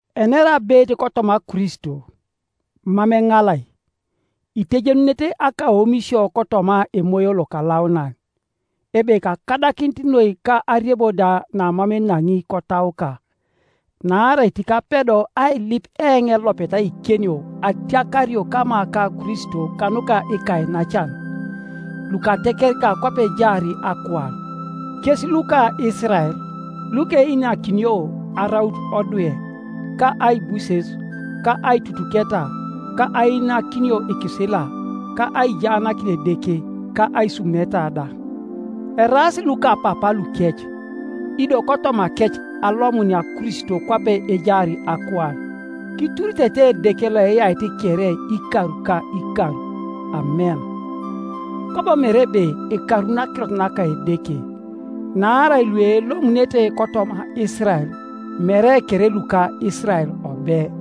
Enera abeit kotoma Kristo, mam eŋalai; itejenunete akaomisio kotoma Emoyo Lokalaunan, ebe kakadakinit noi ka ariebo da namam enaŋi kotauka. Naarai tikapedo ailip eoŋ elopet aikenio atiakario kama ka Kristo kanuka ikainacan, lukatekerika kwape ejaar akuan, kes luka Isirael, lukeinakinio araut odwe, ka aibuses, ka aitutuketa, ka ainakinio ikisila, ka aijaanakin Edeke, ka aisumuneta da; eraas lukapapaa lukec, ido kotomakec alomunia Kristo kwape ejaar akuan. Kituritete Edeke loeyait kere ikar ka ikar. Amen. Kwabo mere ebe ekarun akirot naka Edeke. Naarai luelomunete kotoma Isirael, mere kere luka Isirael obe,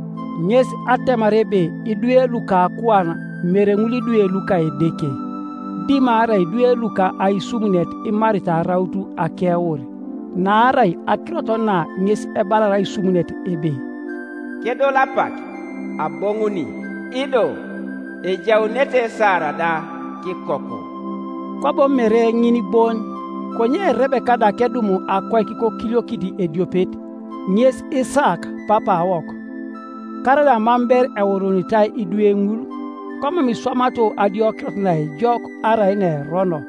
Ŋes atemar ebe idwe luka akuan mere ŋul idwe luka Edeke, dimarai idwe luka aisumunet imaritai araut akeur. Naarai akirot na ŋes ebalar aisumunet ebe, “Kedol apak, aboŋuni, ido ejaunete Sara da kikoku.” Kwabo mere ŋin bon, konye Rebeka da kedum akoik kokiliokit ediopet, ŋes Isaak papaawok, karaida mam ber euruunitai idwe ŋul, komam iswamato adiokirot naejok arai naerono,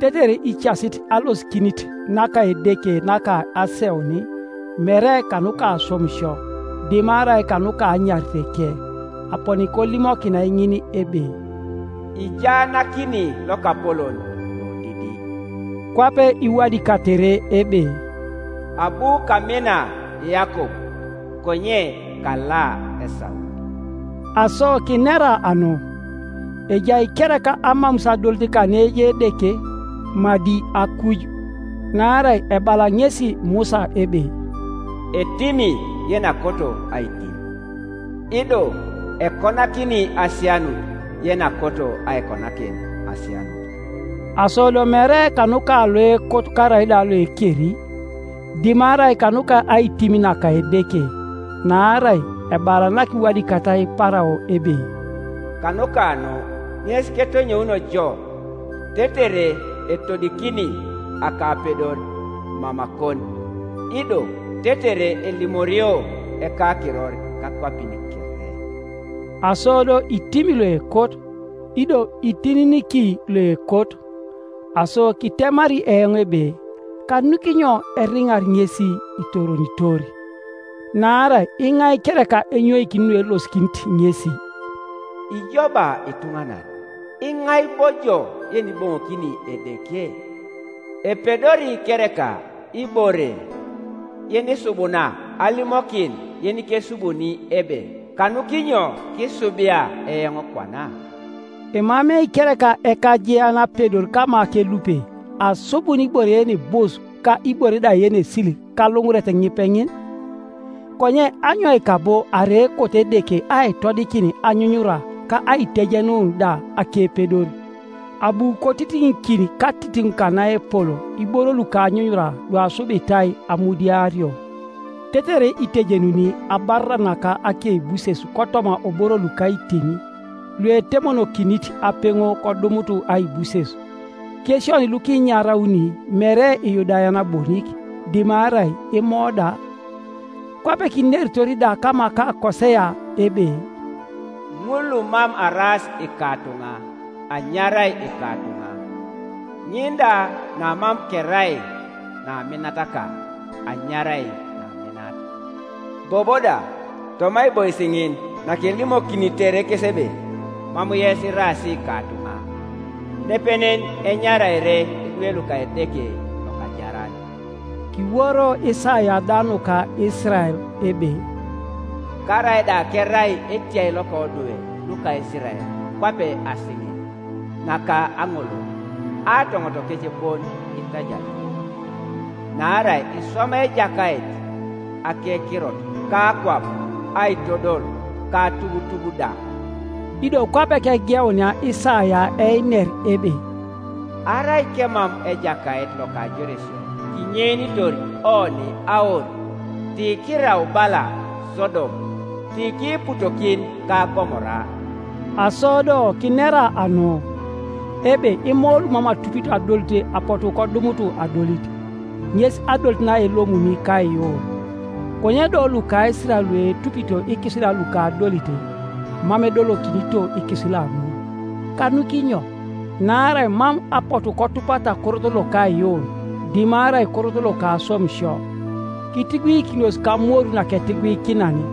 tetere icasit alosikinit naka Edeke naka aseun, mere kanuka aswamisio, dimarai kanuka anyariteke, aponi kolimokinai ŋin ebe, “Ijaanakini lokapolon lodidi.” Kwape iwadikatere ebe, “Abu kamina Yakob, konye kala Esau.” Aso kinera anu? Ejai kereka amamus adolit kaneejai Edeke? Madi akuj! Naarai ebala ŋesi Musa ebe, “Etimi yenakoto aitim, ido ekonakini asianut yenakoto aikonakin asianut.” Aso do mere kanuka loekot karaida loekeri, dimarai kanuka aitim naka Edeke. Naarai ebala nakiwadikatai Parao ebe, “Kanuka nu ŋes ketonyounio jo tetere etodikini akapedor mamakon, ido tetere elimorio ekakiror kakwapin kere.” Aso do itimi loekot, ido itininiki loekot. Aso kitemari eoŋ ebe, “Kanukinyo eriŋar ŋesi itoronitor? Naarai iŋai kereka enyoikini nuelosikinit ŋesi?” Ijo ba ituŋanan, iŋai bo ijo yeniboŋokini Edeke? Epedori kereka ibore yenisubuna alimokin yenikesubuni ebe, “Kanukinyo kiisubia eoŋ kwana?” Emamei kereka ekajean apedor kama kelupe, asubun ibore yenibus ka ibore da yenesil kaluŋuret ŋipeŋin? Konye anyoika bo arai ekoto Edeke aitodikin anyunyura ka aitejenun da akepedor, abu kotitiŋikin katitiŋ kanaepol iboro luka anyunyura luasubitai amudiario, tetere itejenuni abarara naka akeibuses kotoma oboro luka aitim, luetemonokinit apeŋo kodumut aibuses, kes oni lukiinyarauni mere Iyudayan bonik, dimarai Imo da? Kwape kineritor da kama ka Kosea ebe, “Ŋul lumam araas ikatuŋa, anyarai ikatuŋa, ŋin da namam kerai naminataka, anyarai naminat.” “Bobo da toma aibois ŋin nakelimokinitere kes ebe, ‘Mam yes iraas ikatuŋa,’ Nepenen enyaraere idwe luka Edeke lokajaran.” Kiworo Isaia da nuka Isirael ebe, “Karaida kerai etiai loka odwe luka Isirael kwape asiŋe naka aŋolol, aatoŋotokec bon itajario; naarai iswamai Ejakait akekirot kakwap aitodol ka atubutub da.” Ido kwape kegeunia Isaia einer ebe: “Arai kemam Ejakait loka ajoresio kinyeinitor oni aur, Ti kiirau bala Sodom, ti kiiputokin ka Gomora.” Aso do kinera anu? Ebe Imo lumam atupito adolit apotu kodumut adolit, ŋes adolit naelomuni kaiyuun. Konye do luka Isirael luetupito ikisila luka adolit, mam edolokinito ikisila ŋul. Kanukinyo? Naarai mam apotu kotupata korot loka aiyuun, dimarai korot loka aswamisio. Kitiguikinos kamoru naketiguikinan,